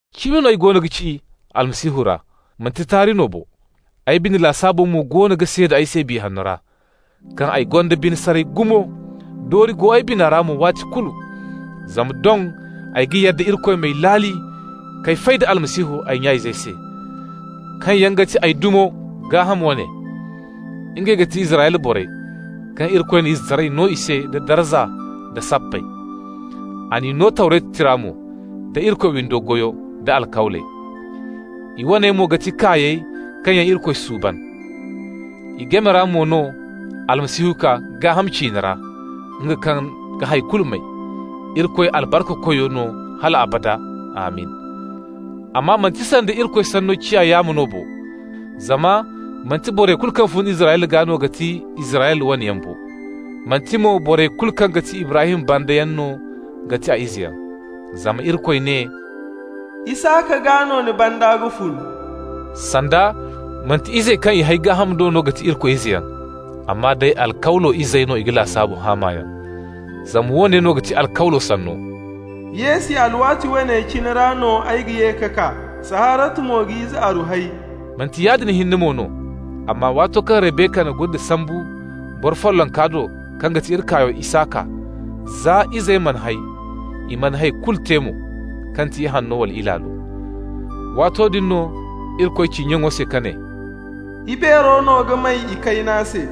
Cimi no ay goono ga ci Almasihu ra, manti taari no bo. Ay bine lasaabo mo goono ga seeda ay se Biya Hanno ra, kaŋ ay gonda bine saray gumo, doori go ay bina ra mo waati kulu. Zama doŋ ay ga yadda Irikoy m'ay laali k'ay fay da Almasihu ay nya-izey se, kaŋ yaŋ ga ti ay dumo, gaaham wane. Ngey ga ti Israyla borey, kaŋ Irikoy na izetaray no i se, da darza, da sappey. A n'i no Tawretu tira mo, da Irikoy windo goyo, da alkawley. I waney mo ga ti kaayey kaŋ yaŋ Irikoy suuban. I game ra mo no Almasihu kaa gaaham ciine ra, nga kaŋ ga hay kulu may, Irikoy albarkakoy no hal abada. Amin! Amma manti sanda Irikoy Sanno ciya yaamo no bo. Zama manti borey kulu kaŋ fun Israyla gaa no ga ti Israyla waneyaŋ bo. Manti mo borey kulu kaŋ ti Ibrahim bandayaŋ no ga ti izeyaŋ. Zama Irikoy ne: «Isaka gaa no ni banda ga fun.» Sanda, manti izey kaŋ i hay gaaham do no ga ti Irikoy izeyaŋ, amma day alkawlo izey no i ga lasaabu haamayaŋ. Zama woone no ga ti alkawlo sanno: «Yeesi alwaati woone cine ra no ay ga ye ka kaa, Saharatu mo ga ize aru hay.» Manti yaadin hinne mo no, amma waato kaŋ Rabeka na gunde sambu boro follonka do kaŋ ga ti iri kaayo Isaka, za izey mana hay, i mana hay kulu te mo, kaŋ ti ihanno wala ilaalo, waato din no Irikoy ci nyaŋo se, ka ne: «Ibeero no ga may ikayna se.»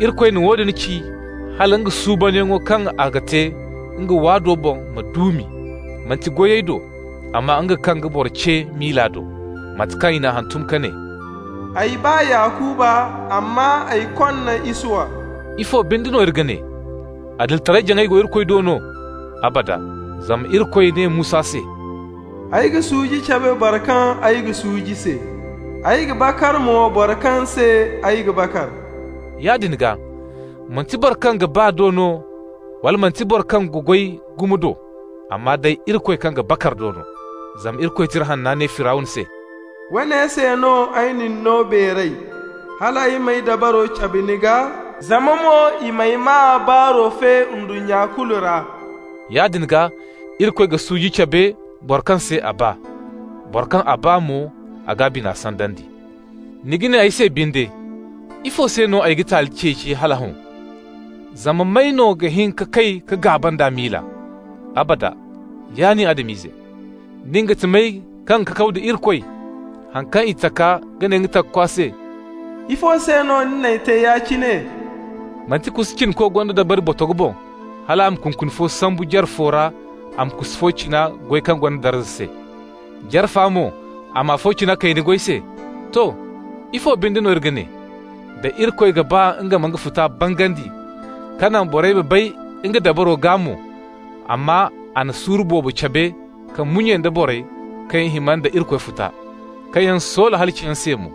Irikoy na woodin ci hala nga suubanyaŋo kaŋ a ga te nga waado boŋ ma duumi, manti goyey do, amma nga kaŋ ga boro ce miila do. Mate kaŋ i n'a hantum ka ne: «Ay ba Yakuba, amma ay konna Isuwa.» Ifo binde no iri ga ne? Adilitaray-jaŋay go Irikoy do no? Abada! Zama Irikoy ne Musa se: «Ay ga suuji cabe boro kaŋ ay ga suuji se. Ay ga bakar mo boro kaŋ se ay ga bakar.» Yaadin gaa, manti boro kaŋ ga ba do no, wala manti boro kaŋ ga goy gumo do, amma day Irikoy kaŋ ga bakar do no. Zama Irikoy Tira Hanna ne Firawna se: «Woone se no ay na ni no beeray: Hal ay m'ay dabaro cabe ni gaa. Zama mo i m'ay maa baaro fe ndunnya kulu ra.» Yaadin gaa Irikoy ga suuji cabe boro kaŋ se a ba. Boro kaŋ a ba mo a g'a bina sandandi. Ni ga ne ay se binde: «Ifo se no a ga taali ceeci hala hõ? Zama may no ga hin ka kay ka gaaba nd'a miila?» Abada, ya nin Adam-ize. Nin ga ti may, kaŋ ga kakaw da Irikoy? Haŋ kaŋ i taka ga ne nga takakwa se: «Ifo se no ni n'ay te ya-cine?» Manti kusu cinako gonda dabari botogo boŋ, hal a ma kunkuni fo sambu, jare fo ra a ma kusu fo cina goy kaŋ gonda darza se. Jare fa mo, a ma afo cina kayna goy se? To, ifo binde no iri ga ne, da Irikoy ga ba nga ma nga futa bangandi, ka naŋ borey ma bay nga dabaro gaa mo, amma a na suuru boobo cabe ka munye nda borey kaŋ yaŋ hima nda Irikoy futa, kaŋ yaŋ soola halaciyaŋ se mo.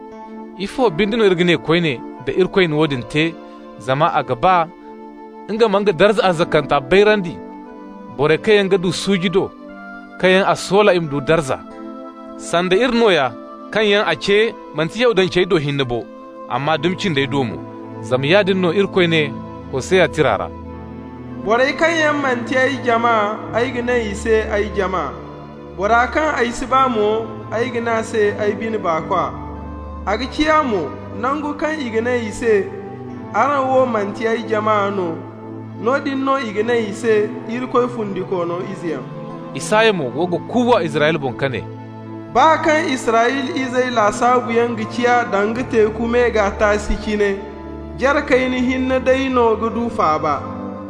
Ifo binde no iri ga ne koyne da Irikoy na woodin te zama a ga ba nga ma nga darza arzakanta bayrandi borey kaŋ yaŋ ga du suuji do, kaŋ yaŋ a soola i ma du darza, sanda iri nooya, kaŋ yaŋ a ce, manti Yahudancey do hinne bo, amma dumi cindey do mo. Zama yaadin no Irikoy ne Hoseya tira ra: «Borey kaŋ yaŋ manti ay jama, ay ga ne i se ay jama. Bora kaŋ ay si ba mo, ay ga ne a se ay bine baakwa.» A ga ciya mo, nangu kaŋ i ne i se: « ‹Araŋ wo manti ay jama no.› Noodin no i ga ne i se: ‹Irikoy fundikoono izeyaŋ.›» Isaya mo go ga kuuwa Israyla boŋ ka ne: «Baa kaŋ Israyla izey lasaabuyaŋ ga ciya danga teeku me gaa taasi cine, Jare kayna hinne day no ga du faaba.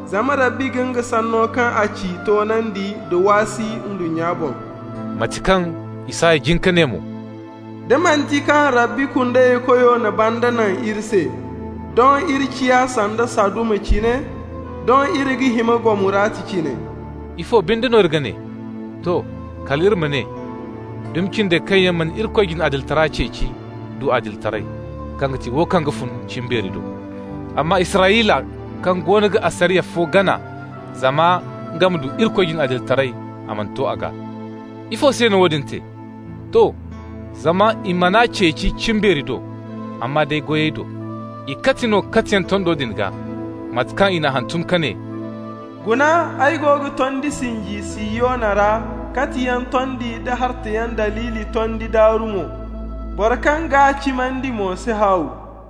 Zama Rabbi ga nga sanno kaŋ a ci toonandi da waasi ndunnya boŋ.» Mate kaŋ Isaya jin ka ne mo: «Da manti kaŋ Rabbi Kundeykoyo na banda naŋ iri se, Doŋ iri ciya sanda Saduma cine, Doŋ iri ga hima Gomorata cine.» Ifo binde no iri ga ne? To, kal iri ma ne: Dumi cindey, kaŋ yaŋ mana Irikoy jine adilitara ceeci, du adilitaray, kaŋ ga ti wo kaŋ ga fun cimbeeri do. Amma Israyla, kaŋ goono ga asariya fo gana zama nga ma du Irikoy jine adilitaray, mana to a gaa. Ifo se no woodin te? To, zama i man'a ceeci cimbeeri do, amma day goyey do. I kati no katiyaŋ tondo din gaa, mate kaŋ i n'a hantum ka ne: «Guna, ay go ga tondi sinji Sihiyona ra, katiyaŋ tondi nda hartayaŋ daliili tondi daaru mo. Boro kaŋ g'a cimandi mo si haaw.»